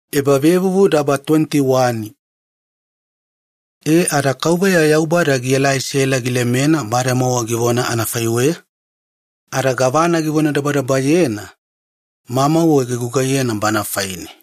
Aisake yana tubuga. E ada Yaubada gilemena Sela bademowa yana vonanuwakabubu anafaiweya, ada gavana Yaubada givonadabadabayena mamauwe gigugaiyena Sela faine.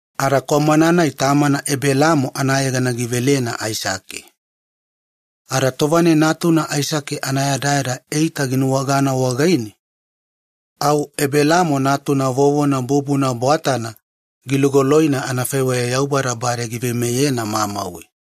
Ada kwamana-nai tamana Ebelaamo anayegana givelena Aisake. Ada tova-nai natuna Aisake anayadayada eita ginuwagana wagaine, au Ebelaamo natuna vovona bubuna bwatana gilugoloina anafaiweya Yaubada bade giveimeyena mamauwe.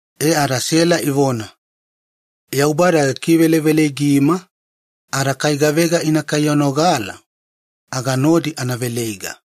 E ada Sela ivona, “Yaubada gikiveveleigima, ada kai gavega ina kaiyanogala, aga nodi ana veleiga.”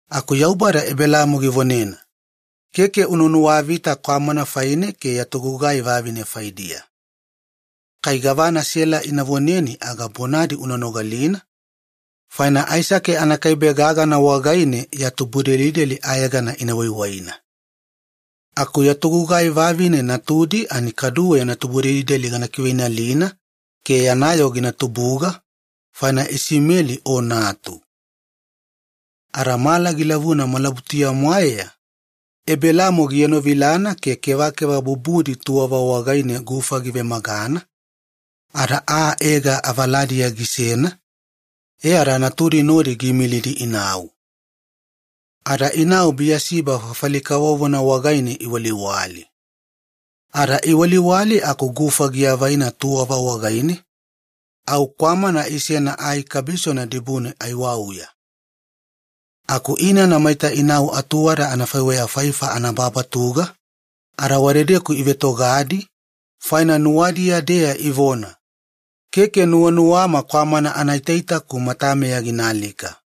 Aku Yaubada Ebelaamo givonena, “Keke una nuwavita kwamana faine ada kaduwe ya togugai vavine faidiya. Kai gavana Sela ina voneni aga bonadi una nogalina, faina Aisake wagaine-deya ya tubudelideli ina yegemona yaku vonadabadaba wagainiya anafaiweya. Aku ya togugai vavine natudi kaduwe yana tubudelideli gana kiveinalina ke yana yoo gina tubuga, faina Isimeli o natu.” Ada mala gilavuna malabutuya-mwaeya Ebelaamo gienovilana ke kevakeva bubudi tuwava wagaine gufa givemagana ada aa Ega giveledi avaladiya gisena, e ada natudi nodi giimilidi inau. E ada inau Biyasiba makama kavovona wagaine iwaliwali. Iwaliwali, aku gufa giavaina tuwava wagaine, au kwamana isena ai kabisona dibune aiwauya. Aku inana maita inau anaatuwada anafaiweya faifa anababatuga, ada wadedeku ivetogadi faina nuwadiya-deya ivona, “Keke nuwanuwama kwamana anaitaita-ku matameya ginaalika,”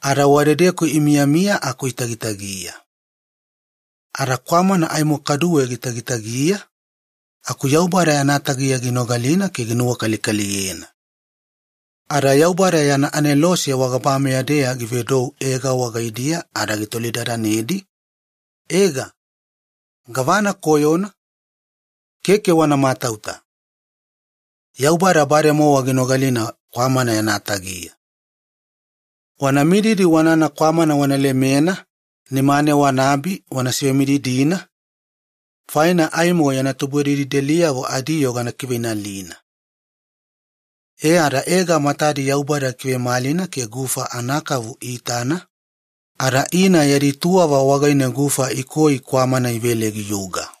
ada wadedeku imiyamiya aku itagitagiya. Ada kwamana aimo kaduwe gitagitagiya, ada Yaubada ginogalina kwamana-nai gitagitagiya ke ginuwakalikaliyena, ada Yaubada yana anelose wagabameya-deya givedou Ega wagaidiya ada gitolidadanedi, “Ega, gavana koyona? Keke wana matauta, Yaubada bademowa ginogalina kwamana yana tagiya. Wanamididi wanana kwamana wana lemena nimane wanaabi wana sivemididina, faina aimo yana tubudelideliyavo adiyoo gana kiveinalina.” E ada Ega matadi Yaubada gikivemalina ke gufa anakavu iitana, ada ina yadi tuwava wagaine gufa ikoi kwamana ivele giyuga.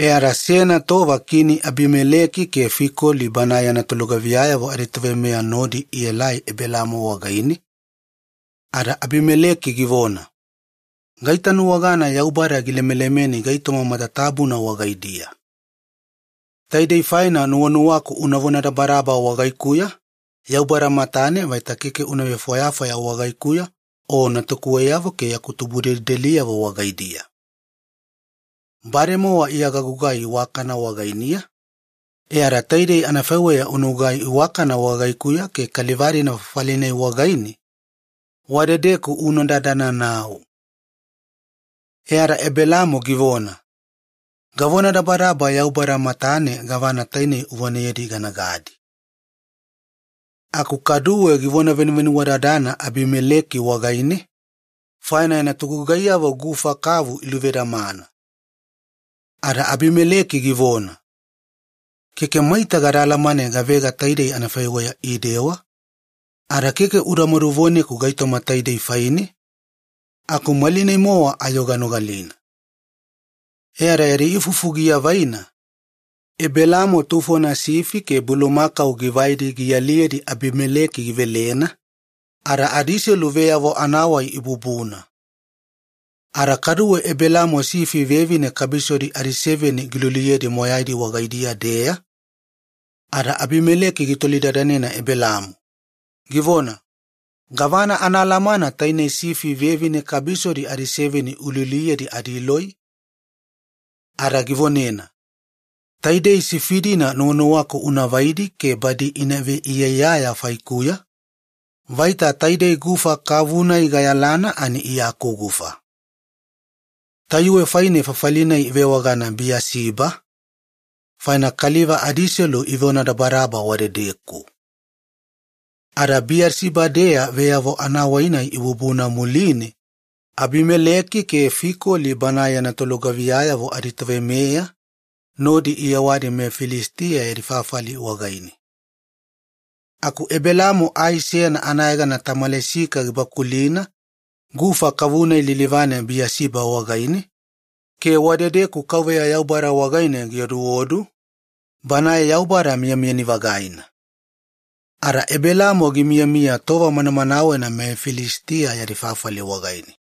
E ada seyana tova Kini Abimaleki ke Fikoli banae yana tolugaviyayavo aditoveimeya nodi ielai Ebelaamo wagaine ada Abimaleki givona, “Gaitanuwagana Yaubada gilemelemeni gaitoma matatabuna wagaidiya. Taidei faina nuwanuwaku una vonadabadaba wagaikuya Yaubada matane vaita keke una vefwayafwaya wagaikuya o natukuweyavo ke yaku tubudelideliyavo wagaidiya. Bademowa iya gagugai iwakana wagainiya, e ada taidei anafaiweya unagugai iwakana wagaikuya ke kaliva-dina fafali-nai wagaine, wadedeku una dadana nau.” E ada Ebelaamo givona, “Gavonadabadaba Yaubada matane gavana tainei uvoneyedi ganagadi.” Aku kaduwe givonavenuvenuwadadana Abimaleki wagaine, faina yana togugaiyavo gufa kavu iluvedamana. Ada Abimaleki givona, “Keke maita gada alamane gavega taidei anafaiweya idewa, ada keke udamadu voneku gaitoma taidei faine, aku malinai-mowa ayo ganogalina.” E ada yadi ifufu giavaina, Ebelaamo tufona sifi ke bulumakau givai gialiyedi Abimaleki givelena, ada adiselu veyavo anavonadabadaba ibubuna. Ada kaduwe Ebelaamo sifi vevine kabisodi adiseveni giluliyedi moyaidi wagaidiya-deya, ada Abimaleki gitolidadanena Ebelaamo, givona, “Gavana anaalamana tainei sifi vevine kabisodi adiseveni ululiyedi adiloi?” Ada givonena, “Taidei sifi-dina nuwanuwaku unavaidi ke badi ina veiyaiyaya faikuya vaita taidei gufa kavu-nai iya gayalana akugufa.” Tayuwe faine fafali-nai ivewagana Biyasiba, faina kaliva adiselu ivevonadabadaba wadedeku. Ada Biyasiba-deya veyavo anavonadabadaba ibubuna muline, Abimaleki ke Fikoli banae yana tolugaviyayavo aditoveimeya nodi iyewadi meFilisitiya yadi fafali wagaine. Aku Ebelaamo ai seyana anayegana tamalisika gibakulina gufa kavu-nai lilivane Biyasiba wagaine, ke wadedeku Yaubada wagaine gioduodu, Banae Yaubada Miyamiyani Vagaina. Ada Ebelaamo gimiyamiya tova manamanawena meFilisitiya yadi fafali wagaine.